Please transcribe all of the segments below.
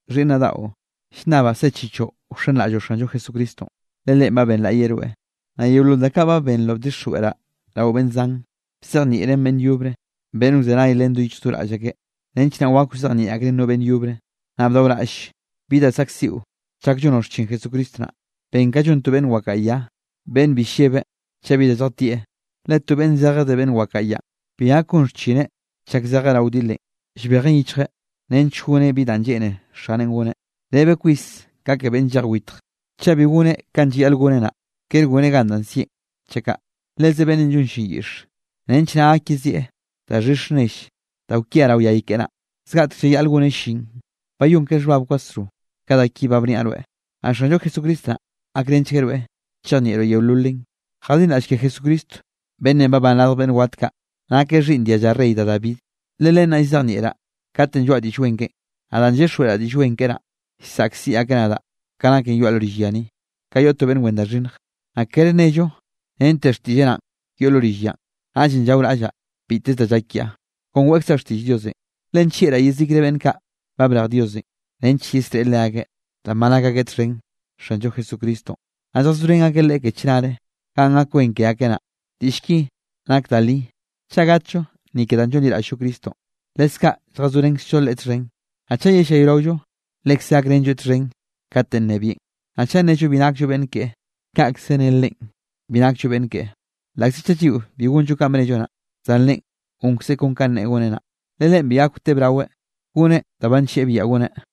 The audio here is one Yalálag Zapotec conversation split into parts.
Xhiꞌnnaꞌ daꞌo, llnnabaꞌ sechichoꞌ wxenraꞌlloꞌ Xanllo Jesucristonꞌ, le Leꞌen ba benlaꞌyeꞌ rweꞌ. Naꞌ yeolol da kaꞌ ba benroꞌ bdixjweꞌraꞌ rao beꞌnn zan, bzejnieꞌren beꞌnn yobre, beꞌnn wzenay len do yichj do raꞌll akeꞌ, nench naꞌ wak wzejnieꞌ akreꞌn no beꞌnn yobre. Naꞌ bdaoraꞌll bi da saꞌkziꞌo chak llonoꞌ xchin Jesucristo naꞌ. Ben ka llon to beꞌnn wakaꞌa ya, beꞌnn bi llebe chaꞌ bi da lljatieꞌ. Le to beꞌnn zeje de beꞌnn wakaꞌa yanꞌ, bi gak gon xchineꞌ chak zejeꞌ rao wdilenꞌ, llbejeꞌn yichjeꞌ nench goneꞌ bi danꞌ lleꞌne xaneꞌn goneꞌ. Rebe kwis ka ke beꞌnn llej witje, chaꞌ bi goneꞌ kanꞌ llayaꞌl goneꞌ naꞌ, kere goneꞌ gan danꞌ sieꞌn chaꞌ kaꞌ. Leze beꞌnn llon llin yiꞌxe, nench naꞌ gak yezieꞌ daxhix nell da kwia rao yay keꞌe naꞌ, zgaꞌtek llayaꞌl goneꞌ llin. Bayón ke xhbab kwasro ka da ki ba bniaꞌ rweꞌ, naꞌ Xanllo Jesucristo naꞌ, gakrenchgueꞌ rweꞌ chejnieꞌroꞌ yeololen. Jadinraꞌll ke Jesucristonꞌ beꞌnnenꞌ babán radj beꞌnn wat kaꞌ, nakeꞌ xhiꞌnn dialla Rey da David. Le len naꞌ llzejnieꞌraꞌ katenꞌ lloaꞌa Diꞌll Wen keꞌen. Naꞌ danꞌ llyixjweꞌraꞌ Diꞌll Wen keꞌe naꞌ, llsaꞌkziꞌ akeꞌ nadaꞌ ka naken yoaꞌ lo rill ya ni, ka yoꞌ to beꞌnn wen da xhinnj. Naꞌ kere nello rente xtiꞌlleꞌ naꞌn yoꞌ lo rill yanꞌ. Naꞌllenꞌ llaoraꞌllaꞌ biteze da llak kiaꞌ, kon weꞌkzaꞌ xtiꞌll Diosenꞌ, le nllieꞌraꞌ yezikre beꞌnn kaꞌ ba brej Diosenꞌ, nench yesreꞌe leakeꞌ danꞌ ba nak akeꞌ txhen Xanllo Jesucristonꞌ, naꞌ lljazorén akeꞌ Leꞌe ke chnare, ganꞌ gak wen ke akeꞌ naꞌ. Diꞌll ki nak da li: Chaꞌ gatllo ni ke danꞌ llonliraꞌll-llo Cristonꞌ, leskaꞌ lljazorenkzllo Leꞌe txhen. Naꞌ chaꞌ yellayraollo, lekze gakrenlloeꞌ txhen katenꞌ nnebieꞌn. Naꞌ chaꞌ nnello bi nakllo beꞌnn keꞌe, kaꞌkze nne Leꞌen bi nakllo beꞌnn keꞌe. Laꞌkze chaꞌ lliꞌo bi gonllo kanꞌ ba bnello naꞌ, zan Leꞌen gonkzeꞌ kon kanꞌ neꞌe goneꞌ naꞌ, le Leꞌen bi gak wtebraweꞌ goneꞌ da ba nllieꞌ biaꞌa goneꞌ.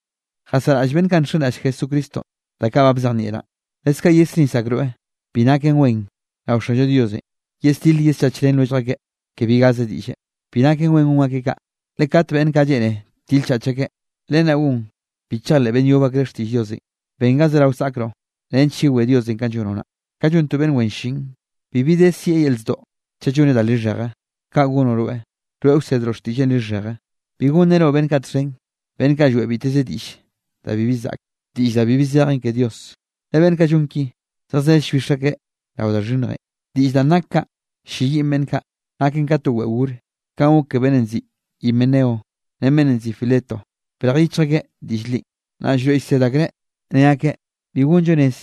Jasaraꞌll beꞌnn kaꞌ nxenraꞌll Jesucristonꞌ da kaꞌ ba bzejnieꞌraꞌn. Leskaꞌ yesnis akroeꞌ bi naken wen rao Xanllo Dios yesdil yeschach ren lwellj akeꞌ ke bi gaze diꞌlle. Bi naken wen gon akeꞌ kaꞌ, le kat beꞌnn kaꞌ lleꞌne til chach akeꞌ, len naꞌ gon bi chejleꞌ beꞌnn yob akreꞌ xtiꞌll Diosenꞌ. Ben ga zerao saꞌkroꞌ, nench yewé Diosenꞌ kanꞌ llonoꞌ naꞌ, ka llon to beꞌnn wen llin, bibi de sieꞌ yel zdoꞌ chaꞌ lloneꞌ da lixheje. Kaꞌ gonoꞌ rweꞌ, wroeꞌ wsedroꞌ xtiꞌlleꞌn lixheje. Bi gonrenoꞌ beꞌnn kaꞌ txhen beꞌnn kaꞌ lloeꞌ biteze diꞌll da bibi zaꞌke, diꞌll da bibi zejen ke Dios, le beꞌnn kaꞌ llon ki, zejzell llbix akeꞌ rao da xhinnjenꞌ. Diꞌll danꞌ nak kaꞌ ll-lleyiꞌn beꞌnn kaꞌ, naken ka to weꞌe gore, kanꞌ gok ke beꞌnnenꞌ nziꞌi Himeneo ren beꞌnnenꞌ nziꞌi Fileto. Brej yichj akeꞌ diꞌll li. Naꞌ Llroeꞌ llsed akreꞌ ne akeꞌ bi gonllo rez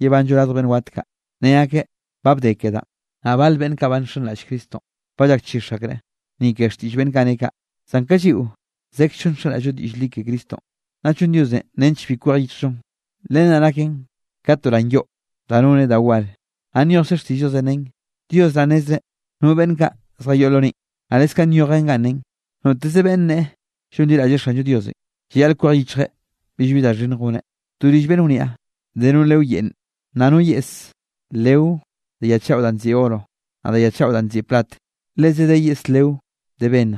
yebanllo radj beꞌnn wat kaꞌ, ne akeꞌ ba bde ke danꞌ. Naꞌ bal beꞌnn kaꞌ ba nxenraꞌll Cristonꞌ ba llakchix akreꞌ, ni ke xtiꞌll beꞌnn kaꞌ ne kaꞌ. Zan ka lliꞌo zekzllo nxenraꞌll-llo diꞌll li ke Cristonꞌ, naꞌ llon Diosenꞌ nench bi kwej yichjllonꞌ. Len naꞌ naken ka to ran yoꞌ da noneꞌ da war. Naꞌ nyojkze xtiꞌll Diosenꞌ nen: “Dios naꞌ nnezreꞌ no beꞌnn kaꞌ zjayoꞌ lo neꞌe.” Naꞌ lekze nyojen ganꞌ nen: “Noteze beꞌnne neꞌe llonliraꞌlleꞌ Xanllo Diosenꞌ, llayaꞌl kwej yichjeꞌ billbi da xhinnj goneꞌ.” To rill beꞌnn wniaꞌ, de no leo yeꞌnne, naꞌ no yeꞌs leo de ya chaꞌo danꞌ nziꞌi oro, naꞌ de ya chaꞌo danꞌ nziꞌi plat. Leze de no yeꞌse leo de bennj,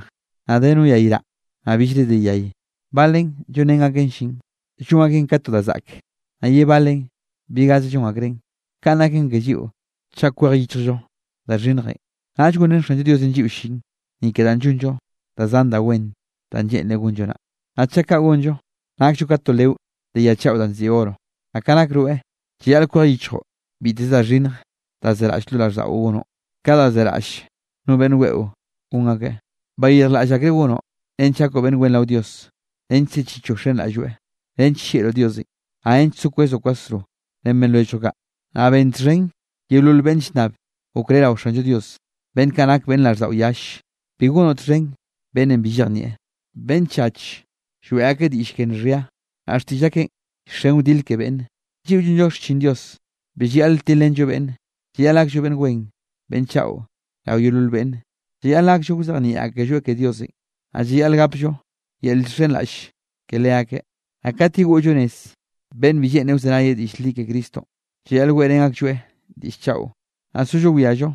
naꞌ de no yayraꞌ, naꞌ billre de yay. Balen llonrén akeꞌ llin, llon akeꞌn ka to da zaꞌke, naꞌ ye balen bi gaze llon akreꞌn. Kanꞌ naken ke lliꞌo, chaꞌ kwej yichjllo da xhinnjenꞌ, naꞌll gonrén Xanllo Diosenꞌ lliꞌo llin, ni ke danꞌ llonllo da zan da wen danꞌ lleꞌnreꞌ gonllo naꞌ. Naꞌ chaꞌ kaꞌ gonllo, nakllo ka to leo de ya chaꞌo danꞌ nziꞌi oro. Naꞌ ka nak rweꞌ, llayaꞌl kwej yichjoꞌ biteze da xhinnj da zeraꞌll lo raꞌlldaꞌon gonoꞌ, ka da zeraꞌll no beꞌnn weꞌo gon akeꞌ. Bayirjlaꞌll akre gonoꞌ nench gakoꞌ beꞌnn wen rao Dios, nench sechichoꞌ wxenraꞌlloeꞌ nench llieꞌroꞌ Diosenꞌ, naꞌ nench so kwezoꞌ kwasro ren beꞌnn lwelljoꞌ kaꞌ. Naꞌ ben txhen yeolol beꞌnn llnnab okré rao Xanllo Dios, beꞌnn kaꞌ nake beꞌnn raꞌlldaꞌo yalle. Bi gonoꞌ txhen beꞌnne bi llejnieꞌ, beꞌnne chach lloeꞌ akeꞌ diꞌll ke nxhia, naꞌ xtiꞌll akeꞌn llxen wdile ke beꞌnne. Lliꞌo llon xchin Dios bi llayaꞌl tilrenllo beꞌnne. Llayaꞌl gakllo beꞌnn wen beꞌnn chaꞌo rao yeolol beꞌnne, llayaꞌl gakllo wzejnieꞌ akelloeꞌ ke Diosenꞌ, naꞌ llayaꞌl gapllo yel llxhenraꞌll ke leakeꞌ. Naꞌ kat yegoꞌllo nez beꞌnn bi lleꞌne wzenay diꞌll li ke Cristonꞌ, llayaꞌl weꞌrén aklloeꞌ diꞌll chaꞌo, naꞌ sollo wiallo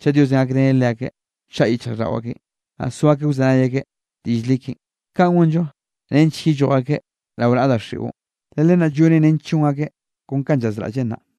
chaꞌ Diosenꞌ gakreneꞌ leakeꞌ, wchaꞌa yichjraꞌlldaꞌo akeꞌn, naꞌ so akeꞌ wzenay akeꞌ ke diꞌll li keꞌen. Kaꞌn gonllo nench yelloj akeꞌ rao naꞌa daxiꞌon, le len naꞌ llonen nench llon akeꞌ kon kanꞌ llazraꞌllen naꞌ.